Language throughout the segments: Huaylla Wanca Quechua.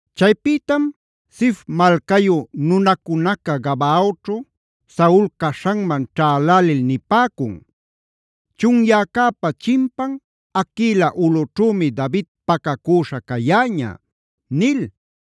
Chaypïtam Zif malcayu nunacunaca Gabaaćhu Saul caśhanman ćhälälil nipäcun: “Chunyäcäpa chimpan Haquila ulꞌućhümi David pacacüśhaa cayäña” nil.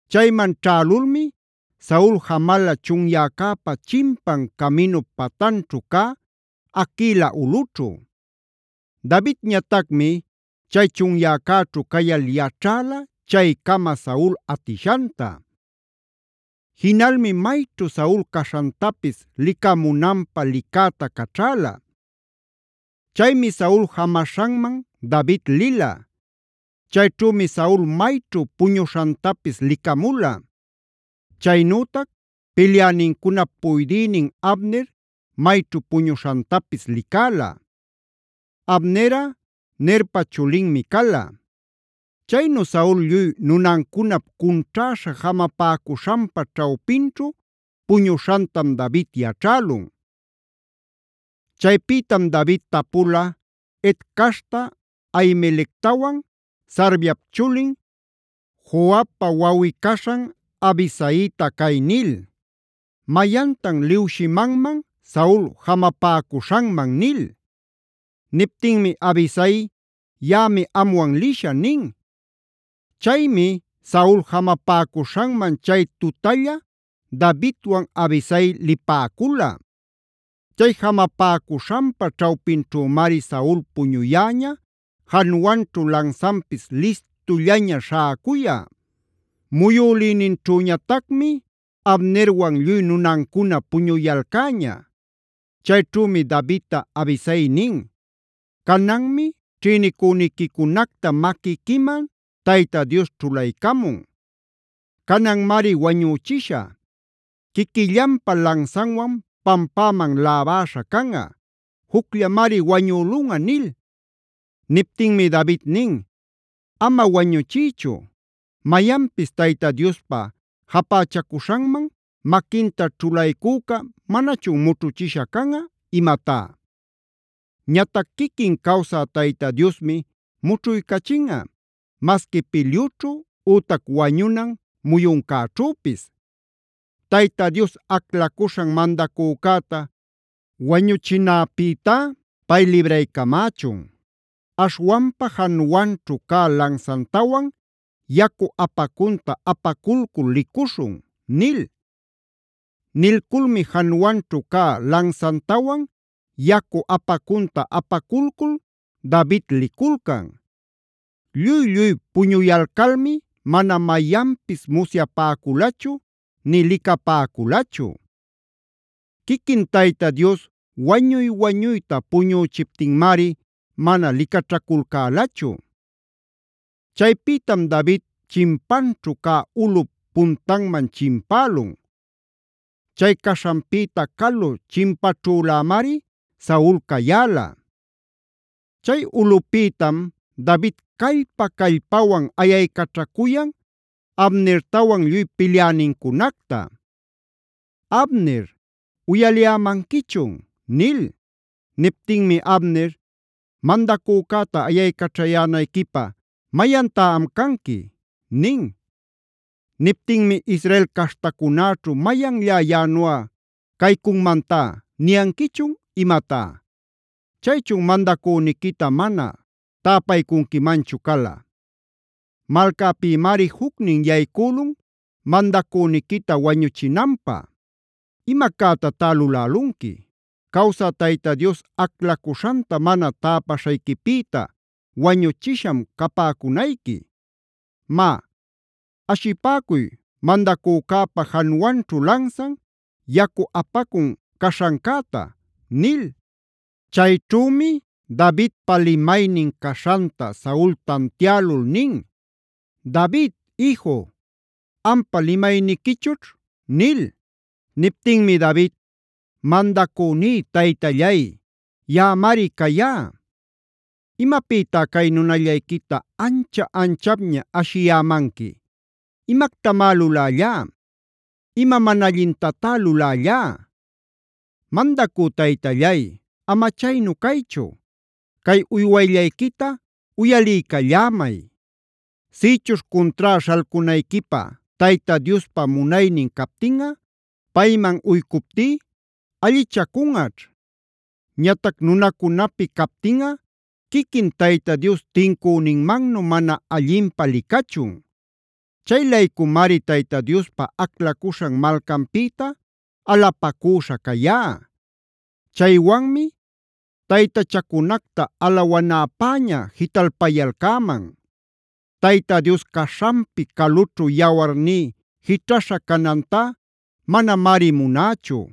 Chayman ćhälulmi Saul jamala chunyäcäpa chimpan caminup patanćhu cä Haquila ulꞌućhu. Davidñatacmi chay chunyäcäćhu cayal yaćhäla chaycama Saul atishanta. Jinalmi mayćhu Saul caśhantapis licamunanpä licätab caćhäla. Chaymi Saul jamaśhanman David lila. Chayćhümi Saul mayćhu puñuśhantapis licamula. Chaynütac pilyänincunap puydïnin Abner mayćhu puñuśhantapis licäla. (Abnerꞌa Nerpa chulinmi cala.) Chaynu Saul lluy nunancunap cunćhäśha jamapäcuśhanpa ćhawpinćhu puñuśhantam David yaćhälun. Chaypïtam David tapula Het caśhta Ahimelectawan Sarviap chulin, Joabpa wawꞌi-caśhan Abisaita cay nil: “¿Mayantan liwshimanman Saul jamapäcuśhanman?” nil. Niptinmi Abisai: “Yaꞌami amwan lishä” nin. Chaymi Saul jamapäcuśhanman chay tutalla Davidwan Abisai lipäcula. Chay jamapäcuśhanpa ćhawpinćhümari Saul puñuyäña januanćhu lansanpis listullaña śhäcuyä. Muyülïnićhüñatacmi Abnerwan lluy nunancuna puñuyalcäña. Chayćhümi Davidta Abisai nin: “Cananmi ćhïnicüniquicunacta maquiquiman Tayta Dios ćhulaycamun. Cananmari wañüchishä; quiquillanpa lansanwan pampäman labäśha canꞌa. Jucllamari wañülunꞌa” nil. Niptinmi David nin: “Ama wañuchiychu. ¿¡Mayanpis Tayta Diospa japächacuśhanman maquinta ćhulaycüca manachun mućhuchisha canꞌa imatá!? Ñatac quiquin cawsä Tayta Diosmi mućhuycachinꞌa, masqui pilyućhu ütac wañunan muyuncäćhüpis. Tayta Dios aclacuśhan mandacücäta wañuchinäpïtá pay libraycamächun. Aśhwanpa januanćhu cä lansantawan yacu apacunta apaculcul licuśhun” nil. Nilculmi januanćhu cä lansantawan yacu apacunta apaculcul David liculcan. Lluy-lluy puñuyalcalmi mana mayanpis musyapäculachu nï licapäculachu. Quiquin Tayta Dios wañuy-wañuyta puñüchiptinmari mana licaćhaculcälachu. Chaypïtam David chimpanćhu cä ulꞌup puntanman chimpälun. Chay caśhanpïta calu chimpaćhülämari Saul cayäla. Chay ulꞌupïtam David callpa-callpawan ayaycaćhacuyan Abnertawan lluy pilyänincunacta: “Abner, ¿uyaliyämanquichun?” nil. Niptinmi Abner: “Mandacücäta ayaycaćhayänayquipä ¿¡mayantá am canqui!?” nin. Niptinmi: “¡Israel caśhtacunäćhu mayanllá yaꞌanuꞌa caycunmantá niyanquichun imatá! ¿Chaychun mandacüniquita mana täpaycunquimanchu cala? Malcäpïmari jucnin yaycülun mandacüniquita wañuchinanpä. Ima cätatá lulälunqui. Cawsä Tayta Dios aclacuśhanta mana täpaśhayquipïta wañuchisham capäcunayqui. Má, ashipäcuy mandacücäpa januanćhu lansan, yacu apacun caśhancäta” nil. Chayćhümi Davidpa limaynin caśhanta Saul tantialul nin: “David iju, ¿ampa limayniquichućh?” nil. Niptinmi David: “Mandacüní taytallay, yaꞌamari cayá. ¿Imapïtá cay nunallayquita ancha-anchapña ashiyämanqui? ¿Imactamá lulällá? ¿Ima mana allintatá lulällá? Mandacü taytallay, ama chaynu caychu, cay uywayllayquita uyaliycallämay. Sïchuśh cuntrá śhalcunayquipä Tayta Diospa munaynin captinꞌa payman uycuptí allichacunꞌaćh. Ñatac nunacunapi captinꞌa quiquin Tayta Dios tincüninmannu mana allinpä licachun. Chay-laycumari Tayta Diospa aclacuśhan malcanpïta alapacüśha cayá; chaywanmi taytachacunacta alawanäpäña jitalpayalcäman. Tayta Dios caśhanpi calućhu yawarní jićhaśha canantá manamari munächu.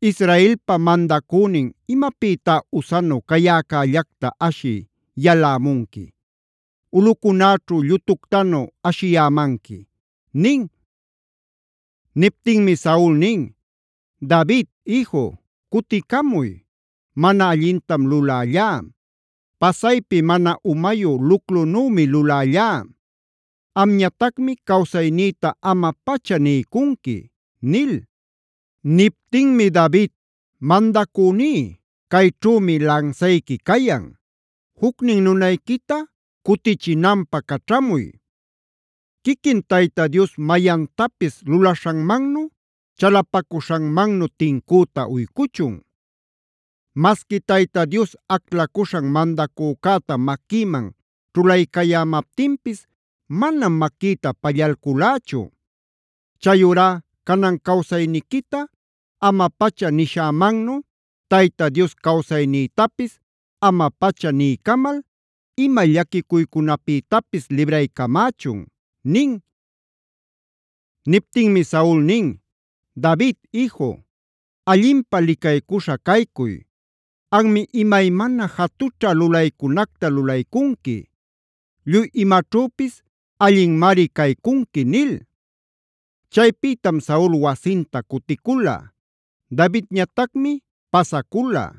Israelpa mandacünin ¿imapïtá usanu cayäcällacta ashï yalämunqui? Ulꞌucunäćhu llutuctanu ashiyämanqui” nin. Niptinmi Saul nin: “David iju, cuticamuy. Mana allintam lulällá. Pasaypi mana umayu luclunümi lulällá. Amñatacmi cawsaynïta ama-pacha niycunqui” nil. Niptinmi David: “Mandacüní, cayćhümi lansayqui cayan. Jucnin nunayquita cutichinanpä caćhamuy. Quiquin Tayta Dios mayantapis lulaśhanmannu, chalapacuśhanmannu tincüta uycuchun. Masqui Tayta Dios aclacuśhan mandacücäta maquïman ćhulaycayämaptinpis manam maquïta pallalculächu. Chayurá canan cawsayniquita ama-pacha nishämannu Tayta Dios cawsaynïtapis ama-pacha niycamal ima llaquicuycunapïtapis libraycamächun” nin. Niptinmi Saul nin: “David iju, allinpä licaycuśha caycuy. Anmi imaymana jatućha lulaycunacta lulaycunqui; lluy imaćhüpis allinmari caycunqui” nil. Chaypïtam Saul wasinta cuticula; Davidñatacmi pasacula.